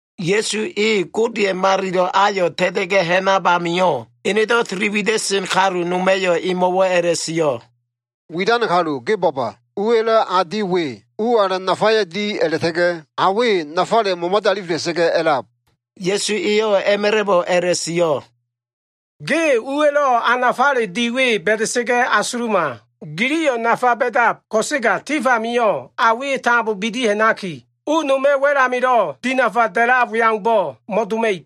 Ya꞉su e Godeya꞉ malilo꞉ ayo꞉ ta꞉ta꞉ga꞉ ha꞉nab amio꞉, enedo꞉ tili wida꞉sen kalu noma꞉yo꞉ emo꞉wo꞉ a꞉la꞉sio꞉, “Widan kalu, ge bo꞉ba! Uwa꞉lo꞉ a di we, u alan nafaya꞉ di a꞉la꞉ta꞉ga꞉ a we nafale momade alifela꞉sa꞉ga꞉ a꞉lab.” Ya꞉su eyo꞉ a꞉ma꞉la꞉bo꞉ a꞉la꞉sio꞉, “Ge uwa꞉lo꞉ a nafale di we ba꞉da꞉sa꞉ga꞉ asuluma. Giliyo꞉ nafa ba꞉dab, ko꞉sega tif amio꞉ a we tambo bidi ha꞉naki, u noma꞉ wa꞉l amilo꞉ dinafa a꞉lab we aumbo꞉ mo꞉doma꞉ib.”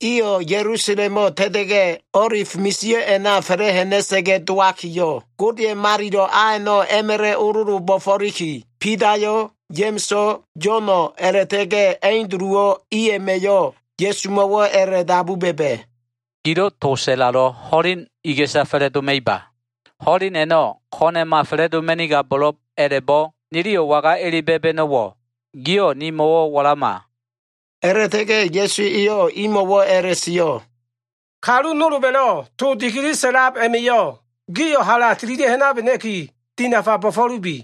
Iyo꞉ Ya꞉lusalemo꞉ ta꞉ta꞉ga꞉, O꞉lif misio꞉ a꞉na fa꞉la꞉ ha꞉na꞉sa꞉ga꞉ dowakiyo꞉, Godeya꞉ malilo꞉ a a꞉no꞉ a꞉ma꞉la꞉ ololo bo꞉fo꞉liki, Bidayo꞉, Ya꞉ma꞉so꞉, Yo꞉no꞉, a꞉la꞉ta꞉ga꞉ Anduluwo꞉, i a꞉ma꞉yo꞉ Ya꞉sumo꞉wo꞉ a꞉la꞉dabu ba꞉ba꞉, “Gilo꞉ to sa꞉lalo꞉, ho꞉leno꞉ iga꞉sa fa꞉la꞉doma꞉iba? Ho꞉len a꞉no꞉ ko꞉na꞉ma fa꞉la꞉doma꞉nigabo꞉lo꞉b a꞉la꞉bo꞉, niliyo꞉ waga ele ba꞉ba꞉no꞉wo꞉? Giyo꞉ nimo꞉wo꞉ walama.” A꞉la꞉ta꞉ga꞉ Ya꞉su eyo꞉ imo꞉wo꞉ a꞉la꞉sio꞉, “Kalu nolba꞉lo꞉ to dikili sa꞉lab a꞉ma꞉yo꞉ gio꞉ hala tililia꞉ ha꞉nabena꞉ki, dinafa bo꞉fo꞉lubi.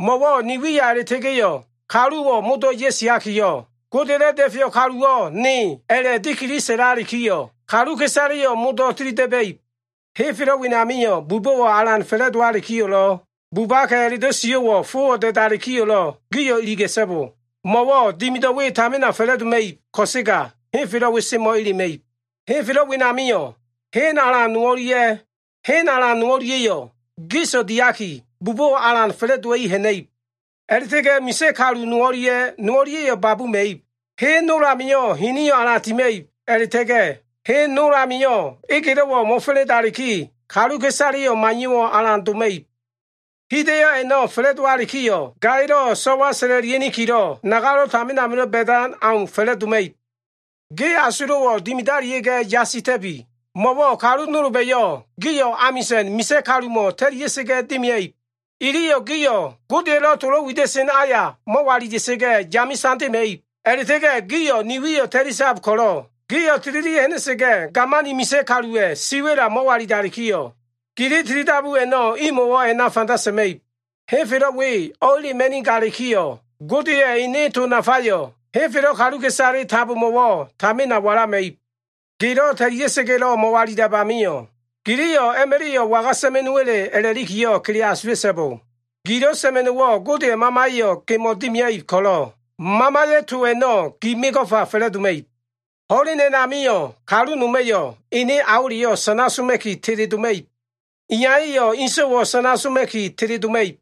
Mo꞉wo꞉ ni wiya a꞉la꞉ta꞉ga꞉yo꞉, kaluwo꞉ modo꞉ ya꞉siakiyo꞉ ‘Godeya꞉lo꞉ Da꞉feyo꞉ kaluwo꞉ ne’ a꞉la꞉ dikili sa꞉lalikiyo꞉, kaluka꞉isaleyo꞉ modo꞉ tilida꞉ba꞉ib. Henfelo꞉ wenamio꞉ bubo꞉wo꞉ alan fa꞉la꞉dowalikiyo꞉lo꞉, bubaka꞉ a꞉la꞉do꞉ sio꞉wo꞉ fowo꞉ da꞉dalikiyo꞉lo꞉, gio꞉ iliga꞉so꞉bo. Mo꞉wo꞉ dimido꞉ we tamina fa꞉la꞉doma꞉ib, ko꞉sega henfelo꞉ we semo꞉ elema꞉ib. Henfelo꞉ wenamio꞉ hen alan no o꞉lia꞉ hen alan no o꞉lia꞉yo꞉, gis diaki bubo꞉wo꞉ alan fa꞉la꞉dowa꞉i ha꞉na꞉ib. A꞉la꞉ta꞉ga꞉ misa꞉ kalu no o꞉lia꞉ no o꞉lia꞉yo꞉ babuma꞉ib. Hen nol amio꞉ hiniyo꞉ alan tima꞉ib, a꞉la꞉ta꞉ga꞉ hen nol amio꞉ egelo꞉wo꞉ mo꞉fa꞉la꞉ndaliki, kaluka꞉isaleyo꞉ maiyo꞉wo꞉ alan doma꞉ib. Hida꞉yo꞉ a꞉no꞉ fa꞉la꞉dowalikiyo꞉, gaya꞉lo꞉ so꞉wa sa꞉la꞉lia꞉nikilo꞉ nagalo꞉ tamin amilo꞉ ba꞉dan au fa꞉la꞉doma꞉ib. “Ge asulo꞉wo꞉ dimidalia꞉ga꞉ yasita꞉bi! Mo꞉wo꞉ kalu nolba꞉yo꞉ gio꞉ amisa꞉n misa꞉ kalumo꞉ ta꞉lia꞉sa꞉ga꞉ dimia꞉ib. Iliyo꞉ gio꞉ Godeya꞉lo꞉ tolo꞉ wida꞉sen aya mo꞉walila꞉sa꞉ga꞉, yame tandema꞉ib. A꞉la꞉ta꞉ga꞉ gio꞉ ni wiyo꞉ ta꞉lisab ko꞉lo꞉, gio꞉ tililia꞉ ha꞉na꞉sa꞉ga꞉, gamani misa꞉ kaluwa꞉ siwa꞉la mo꞉walilalikiyo꞉, gili tilidabu a꞉no꞉ imo꞉wo꞉ a꞉na fanda sa꞉ma꞉ib. Henfelo꞉ we o꞉elema꞉nigalikiyo꞉, Godeya꞉ ene to nafayo꞉ henfelo꞉ kaluka꞉isale tambomo꞉wo꞉ tamina walama꞉ib. Gelo꞉ ta꞉lia꞉sa꞉ga꞉lo꞉ mo꞉walilab amio꞉, giliyo꞉ a꞉ma꞉la꞉yo꞉ waga sa꞉ma꞉no꞉wa꞉le a꞉la꞉likiyo꞉ kele asula꞉so꞉bo. Gilo꞉ sa꞉ma꞉no꞉wo꞉ Godeya꞉ Mamaya꞉yo꞉ gemo꞉ dimia꞉ib ko꞉lo꞉, Mamaya꞉ to a꞉no꞉ gi mego꞉fa fa꞉la꞉doma꞉ib. “Ho꞉len a꞉namio꞉ kalu noma꞉yo꞉ ene aoleyo꞉ sana soma꞉ki teledoma꞉ib. Iyaya꞉yo꞉ inso꞉wo꞉ sana soma꞉ki teledoma꞉ib.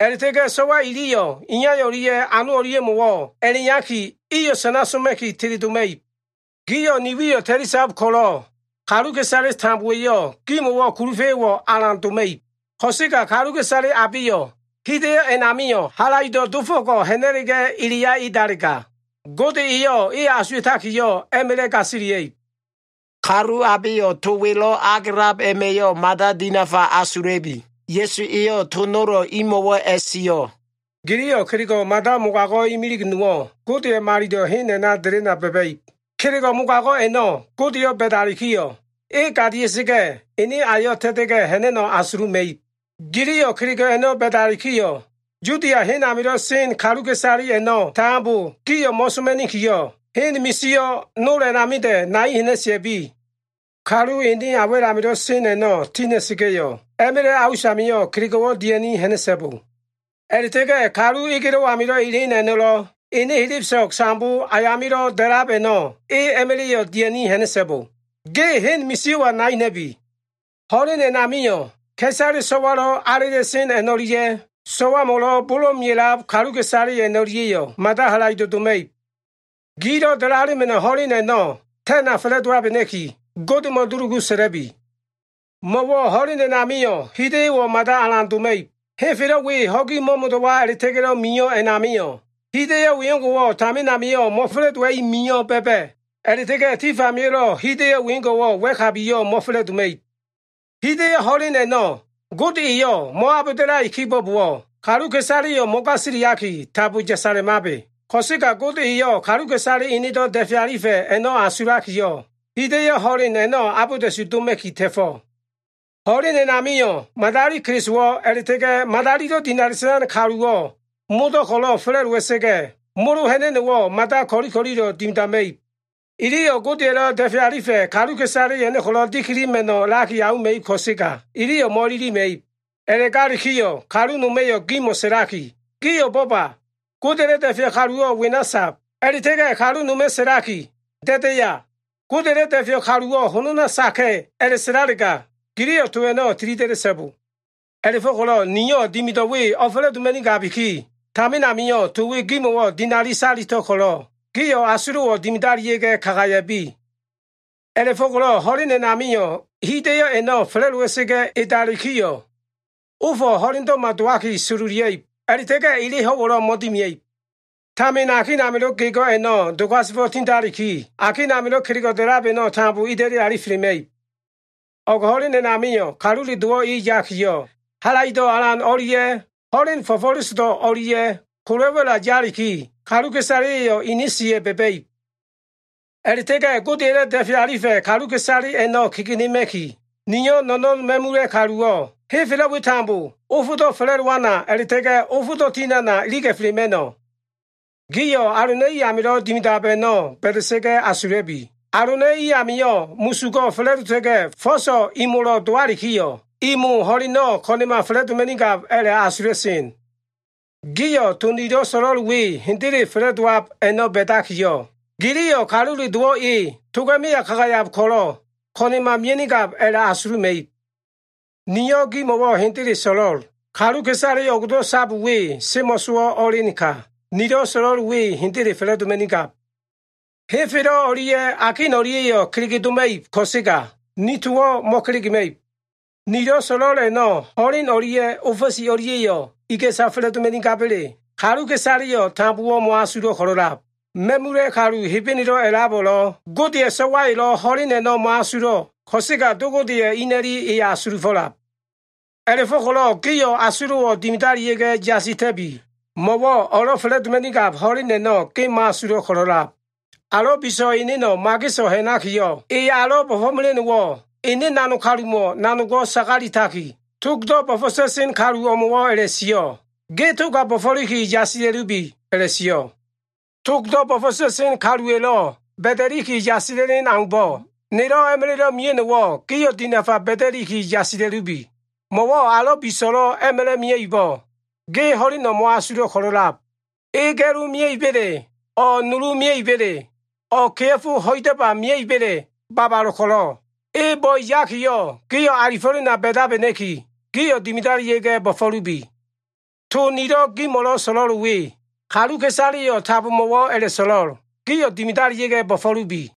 A꞉la꞉ta꞉ga꞉ so꞉wa iliyo꞉ iya o꞉lia꞉ ano o꞉lia꞉mo꞉wo꞉ a꞉la꞉iyaki, iyo꞉ sana soma꞉ki teledoma꞉ib. Gio꞉ ni wiyo꞉ ta꞉lisab ko꞉lo꞉, kaluka꞉isale tambowa꞉yo꞉ gimo꞉wo꞉ kulufa꞉yo꞉wo꞉ alan doma꞉ib. Ko꞉sega kaluka꞉isale abeyo꞉ hida꞉yo꞉ a꞉namio꞉ halaido꞉ dofo꞉ko꞉ ha꞉na꞉la꞉ga꞉ eleya edalega, Gode eyo꞉ e asuwa꞉takiyo꞉ a꞉ma꞉la꞉ gasilia꞉ib.” Kalu abeyo꞉ to welo꞉ agelab a꞉ma꞉yo꞉ mada dinafa asula꞉bi. Ya꞉su eyo꞉ to nolo꞉ imo꞉wo꞉ a꞉sio꞉, “Giliyo꞉ kelego꞉ mada mogago꞉ imilig nowo꞉ Godeya꞉ Malilo꞉ hen a꞉na delena ba꞉ba꞉ib. Kelego꞉ mogago꞉ a꞉no꞉ Godeyo꞉ ba꞉dalikiyo꞉, e gadia꞉sa꞉ga꞉ ene ayo꞉ ta꞉ta꞉ga꞉ ha꞉na꞉no꞉ asuluma꞉ib. Giliyo꞉ kelego꞉ a꞉no꞉ ba꞉dalikiyo꞉, Yudia hen amilo꞉ sen kaluka꞉isale a꞉no꞉ tambo, gio꞉ mo꞉soma꞉nikiyo꞉, hen misio꞉ nol a꞉namida꞉ nai ha꞉na꞉sia꞉bi. Kalu ene a wa꞉l amilo꞉ sen a꞉no꞉ tina꞉sa꞉ga꞉yo꞉, a꞉ma꞉la꞉ a usamio꞉ kelego꞉wo꞉ dia꞉ni ha꞉na꞉so꞉bo. A꞉la꞉ta꞉ga꞉ kalu egelo꞉ amilo꞉ elen a꞉no꞉lo꞉, ene helebeso꞉g sambo ayamilo꞉ da꞉lab a꞉no꞉ e a꞉ma꞉la꞉yo꞉ dia꞉ni ha꞉na꞉so꞉bo. Ge hen misio꞉wa nai ha꞉na꞉bi. Ho꞉len a꞉namio꞉ ka꞉isale so꞉walo꞉ alela꞉sen o꞉lia꞉ so꞉wamo꞉lo꞉ bolo꞉ mea꞉lab ka꞉isale a꞉no꞉lia꞉yo꞉ mada halaido꞉ doma꞉ib. Gilo꞉ dalalema꞉no꞉ ho꞉len a꞉no꞉ ta꞉na fa꞉la꞉dowabena꞉ki, Godemo꞉ dulugu sa꞉la꞉bi. Mo꞉wo꞉ ho꞉len a꞉namio꞉ hida꞉yo꞉wo꞉ mada alan doma꞉ib. Henfelo꞉ we ho꞉gi mo꞉mo꞉do꞉wa a꞉la꞉ta꞉ga꞉lo꞉ mio꞉ a꞉namio꞉, hida꞉yo꞉ wengo꞉wo꞉ tamin amio꞉ mo꞉fa꞉la꞉dowa꞉i mio꞉ ba꞉ba꞉. A꞉la꞉ta꞉ga꞉ tif amio꞉lo꞉ hida꞉yo꞉ wengo꞉wo꞉ wa꞉kabiyo꞉ mo꞉fa꞉la꞉doma꞉ib. Hida꞉yo꞉ ho꞉len a꞉no꞉ Gode eyo꞉ mo꞉abolda꞉lai kibo꞉bowo꞉, kaluka꞉isaleyo꞉ mo꞉gasiliaki tambo yasalemabe. Ko꞉sega Gode eyo꞉ kaluka꞉isale enedo꞉ da꞉fe alifa꞉ a꞉no꞉ asulakiyo꞉, hida꞉yo꞉ ho꞉len a꞉no꞉ abolda꞉su doma꞉ki ta꞉fo꞉. Ho꞉len a꞉namio꞉ madali Kelisowo꞉, a꞉la꞉ta꞉ga꞉ madalilo꞉ dinali sa꞉lan kaluwo꞉ modo꞉ ko꞉lo꞉ fa꞉la꞉dowa꞉sa꞉ga꞉, molo ha꞉na꞉no꞉wo꞉ mada ko꞉li ko꞉lilo꞉ dimidama꞉ib. Iliyo꞉ Godeya꞉lo꞉ da꞉fe alifa꞉ kaluka꞉isale a꞉no꞉ ko꞉lo꞉ dikilima꞉no꞉laki auma꞉ib ko꞉sega, iliyo꞉ mo꞉ililima꞉ib. A꞉la꞉galikiyo꞉ kalu noma꞉yo꞉ gimo꞉ sa꞉laki, ‘Gio꞉ bo꞉ba! Godeya꞉lo꞉ da꞉feyo꞉ kaluwo꞉ wena sab.’ A꞉la꞉ta꞉ga꞉ kalu noma꞉ sa꞉laki, ‘Da꞉daya? Godeya꞉lo꞉ da꞉feyo꞉ kaluwo꞉ honona saka꞉’ a꞉la꞉sa꞉lalega, giliyo꞉ to a꞉no꞉ tilida꞉da꞉so꞉bo! A꞉la꞉fo꞉ko꞉lo꞉ niyo꞉ dimido꞉ we o꞉fa꞉la꞉doma꞉nigabiki, tamin amio꞉ to we gimo꞉wo꞉ dinali salito꞉l ko꞉lo꞉, gio꞉ asulo꞉wo꞉ dimidalia꞉ga꞉ kagaya꞉bi. “A꞉la꞉fo꞉ko꞉lo꞉ ho꞉len a꞉namio꞉, hida꞉yo꞉ a꞉no꞉ fa꞉la꞉dowa꞉sa꞉ga꞉ edalikiyo꞉, “ ‘Ofo꞉ ho꞉lendo꞉ma dowaki sololia꞉ib, a꞉la꞉ta꞉ga꞉ ele ho꞉wo꞉lo꞉ mo꞉dimia꞉ib. Tamin akin amilo꞉ ga꞉go꞉ a꞉no꞉ dogasefo꞉ tindaliki, akin amilo꞉ kelego꞉ da꞉lab a꞉no꞉ tambo ida꞉li alifelema꞉ib.’ “O꞉g ho꞉len a꞉namio꞉ Kalule Dowo꞉ e yakiyo꞉, halaido꞉ alan o꞉lia꞉ ho꞉len fo꞉fo꞉lesodo꞉ o꞉lia꞉ kola꞉ wa꞉la yaliki, kaluka꞉isaleya꞉yo꞉ ini siya꞉ ba꞉ba꞉ib. A꞉la꞉ta꞉ga꞉ Godeya꞉lo꞉ da꞉fe alifa꞉ kaluka꞉isale a꞉no꞉ kegenema꞉ki, niyo꞉ no꞉no꞉n ma꞉mula꞉ kaluwo꞉, henfelo꞉ we tambo ofdo꞉ fa꞉la꞉dowana a꞉la꞉ta꞉ga꞉ ofdo꞉ tinana iliga꞉felema꞉no꞉. “Gio꞉ alona꞉i amilo꞉ dimidab a꞉no꞉ ba꞉da꞉sa꞉ga꞉ asula꞉bi. Alona꞉ i amio꞉ musugo꞉ fa꞉la꞉dota꞉ga꞉ fo꞉so꞉ imolo꞉ dowalikiyo꞉, imo ho꞉leno꞉ ko꞉na꞉ma fa꞉la꞉doma꞉nigab a꞉la꞉asula꞉sen. Gio꞉ to nilo꞉ so꞉lo꞉l we hendele fa꞉la꞉dowab a꞉no꞉ ba꞉dakiyo꞉, giliyo꞉ Kalule Dowo꞉ e toga꞉ meya kagayab ko꞉lo꞉ ko꞉na꞉ma mia꞉nigab a꞉la꞉asuluma꞉ib. Niyo꞉ gimo꞉wo꞉ hendele so꞉lo꞉l. Kaluka꞉isale o꞉gdo꞉ sab we semo꞉sowo꞉ o꞉elenka, nilo꞉ so꞉lo꞉l we hendele fa꞉la꞉doma꞉nigab. Henfelo꞉ o꞉lia꞉ akin o꞉lia꞉yo꞉ kelege doma꞉ib ko꞉sega, ni towo꞉ mo꞉kelegema꞉ib. “Nilo꞉ so꞉lo꞉l a꞉no꞉ ho꞉len o꞉lia꞉ ofa꞉si o꞉lia꞉yo꞉ iga꞉sa fa꞉la꞉doma꞉nigaba꞉le, kaluka꞉isaleyo꞉ tambo mo꞉asulo꞉ ko꞉lo꞉lab. Ma꞉mula꞉ kalu Hebenelo꞉ a꞉labo꞉lo꞉, Godeya꞉ So꞉wayo꞉lo꞉ ho꞉len a꞉no꞉ mo꞉asulo꞉ ko꞉sega, Do Godeya꞉ ina꞉li e asulufo꞉lab. A꞉la꞉fo꞉ko꞉lo꞉ gio꞉ asulo꞉wo꞉ dimidalia꞉ga꞉ yasita꞉bi! Mo꞉wo꞉ o꞉lo꞉ fa꞉la꞉doma꞉nigab ho꞉len a꞉no꞉ ge mo꞉asulo꞉ ko꞉lo꞉lab. Alo꞉ biso꞉ eneno꞉ mageso꞉ ha꞉nakiyo꞉, e alo꞉ bo꞉fo꞉mela꞉no꞉wo꞉ ene nanog kalumo꞉ nanogo꞉ sagaletaki, togdo꞉ bo꞉fo꞉ta꞉sen kalu o꞉mo꞉wo꞉ a꞉la꞉sio꞉, ‘ge toga bo꞉fo꞉liki yasila꞉lubi’ a꞉la꞉sio꞉. “Togdo꞉ bo꞉fo꞉ta꞉sen kaluwa꞉lo꞉ ba꞉da꞉li yasila꞉len aumbo꞉, nelo꞉ a꞉ma꞉la꞉lo꞉ mia꞉no꞉wo꞉ gio꞉ dinafa ba꞉da꞉liki yasila꞉lubi. Mo꞉wo꞉ alo꞉ biso꞉lo꞉ a꞉ma꞉la꞉ mia꞉ibo꞉, ge ho꞉leno꞉ mo꞉asulo꞉ ko꞉lo꞉lab. E ga꞉lo mia꞉iba꞉le, o꞉ nulu mia꞉iba꞉le, o꞉ kea꞉fo ho꞉idaba mia꞉iba꞉le babalo꞉ ko꞉lo꞉, e bo꞉e yakiyo꞉ gio꞉ alifo꞉lena ba꞉dabena꞉ki, gio꞉ dimidalia꞉ga꞉ bo꞉fo꞉lubi. To nilo꞉ gimo꞉lo꞉ so꞉lo꞉l we, kaluka꞉isaleyo꞉ tambomo꞉wo꞉ a꞉la꞉so꞉lo꞉l, ‘Gio꞉ dimidalia꞉ga꞉ bo꞉fo꞉lubi.’”